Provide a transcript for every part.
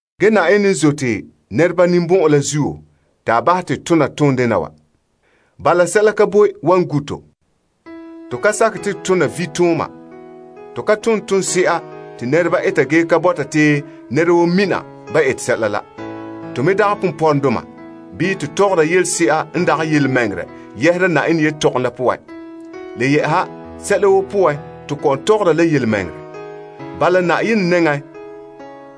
Ge Na'ayenɛ n zote nɛreba ninbɔn'ɔn la zuo te a bahɛ te to tona toondena wa. Bala, sɛla ka boe wan sagom to sunya. To ka sakɛ te to tona vitooma ge to ka tone toonse'a te nɛreba eta ge ka bɔta te nɛra woo mina ba ete sɛla la. To me dagɛ ponpɔrɔŋdoma bii to tɔgɔra yelese'a n dagɛ yelemɛŋɛrɛ yɛhera Na'ayenɛ yetɔgom la poan. Le yɛ'ɛha, sɛla woo poan, to kɔ'ɔn tɔgɔra la yelemɛŋɛrɛ. Bala Na'ayenɛ nɛŋan,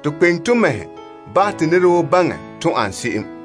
to kpeŋe to mɛhe bahɛ te nɛra woo baŋɛ to ane se'em.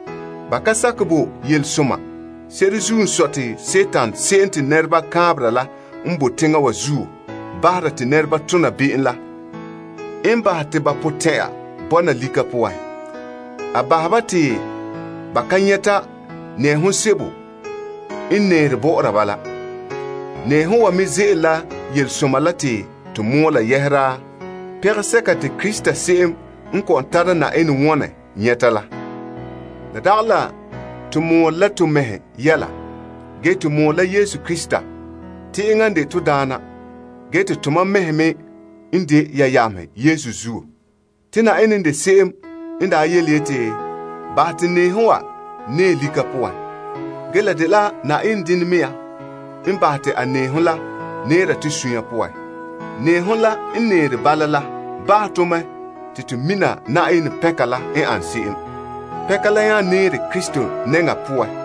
Ba ka sakɛ bo Yelesoma. Se'ere n sɔe la Dima la n de teŋa wa zuo yenɛ la bahɛ te ba potɛn'ɛra bɔna lika poan. A bahɛ ba te ba ka nyɛta nɛɛhom sebo n nɛɛre bɔ'ɔra ba la. Nɛɛhom wa me ze'ele la Yelesoma la te to mɔɔla yɛhera pɛngɛsɛka te Krista se'em n kɔ'ɔn tara Na'ayenɛ wɔne nyɛta la. La dagɛ la to mɔɔla la to mɛhe yɛla. Ge to mɔɔle la Yesu Krista te enŋa n de to Daana ge tomam mɛhe me n de ya yamehe Yesu zuo. Te Na'ayenɛ n de se'em n daa yeti, Bahɛ te nɛɛhom wan nɛɛ lika poan. Ge la dela Na'ayenɛ dene mea n bahɛ te a nɛɛhom la nɛɛra to sunya poan. Nɛɛhom la n nɛɛre bala, la bahɛ to mɛ te to mina Na'ayenɛ pɛnka la n ane se'em. Pɛnka la nya nɛɛre Krista nɛŋa poan.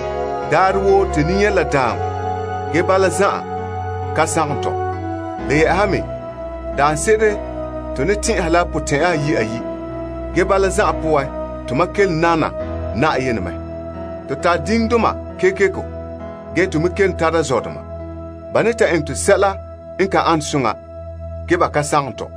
Daarɛ woo to ne nyɛ la daaŋɔ ge bala zan'an ka sagom tɔ. Le yɛ'ɛha me daanse'ere to ne tɛn'ɛha la potɛn'ya ayi' ayi', ge bala zan'an poan, tomam kelom nam Na'ayenɛ mɛ. To tare diŋdoma kekeko, ge to me kelom tara zɔdoma. Ba ne ta eŋɛ tɔ sɛla n ka ane soŋa, ge ba ka sagone tɔ.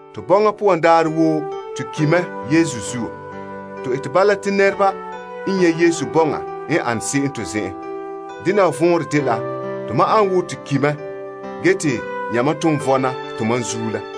To bɔŋa poan daarɛ woo to ki la Yesu zuo. To ete bala te nɛreba nyɛ Yesu bɔŋa n ane se'em to zen'en. Bala te tomam ane wo to ki mɛ ge te yamam ton vɔna tomam zuo.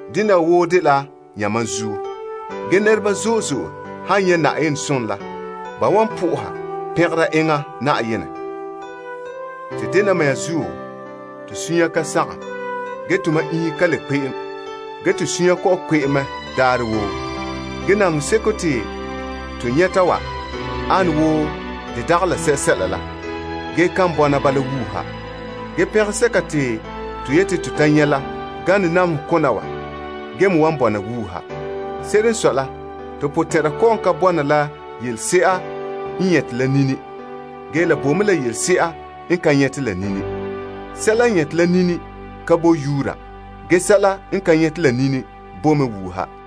Dena wa woo dela yamam zuo. Ge nɛreba zo'e zo'e han nyɛ' Na'ayenɛ som la, ba wan na'aha Yenɛ la pɛnka kaanbegɔ kekeko. Te dena mea zuo, sɛla ka boe wan sagom to sunya. Ge la tomam iŋhe ka le kpe'em, ge to suunre kɔ'ɔn kpe'em mɛ daarɛ woo. Ge namehe seko te to nyɛta wa ane wo de dagɛ la sɛsɛla la ge kan bɔna bala wuuha. Ge pɛngɛsɛka te to yeti to ta nyɛ la gane namehe kona wa ge me wan bɔna wuuha. Se'ere n sɔe la, to potɛn'ɛrɛ kɔ'ɔn ka bɔna la yelese'a n nyɛte la nini. Ge la boe mɛ la yelese'a n ka nyɛte la nini. Sɛla n nyɛte la nini ka boe yuura, ge sɛla n ka nyɛte la nini bo mɛ wuuha.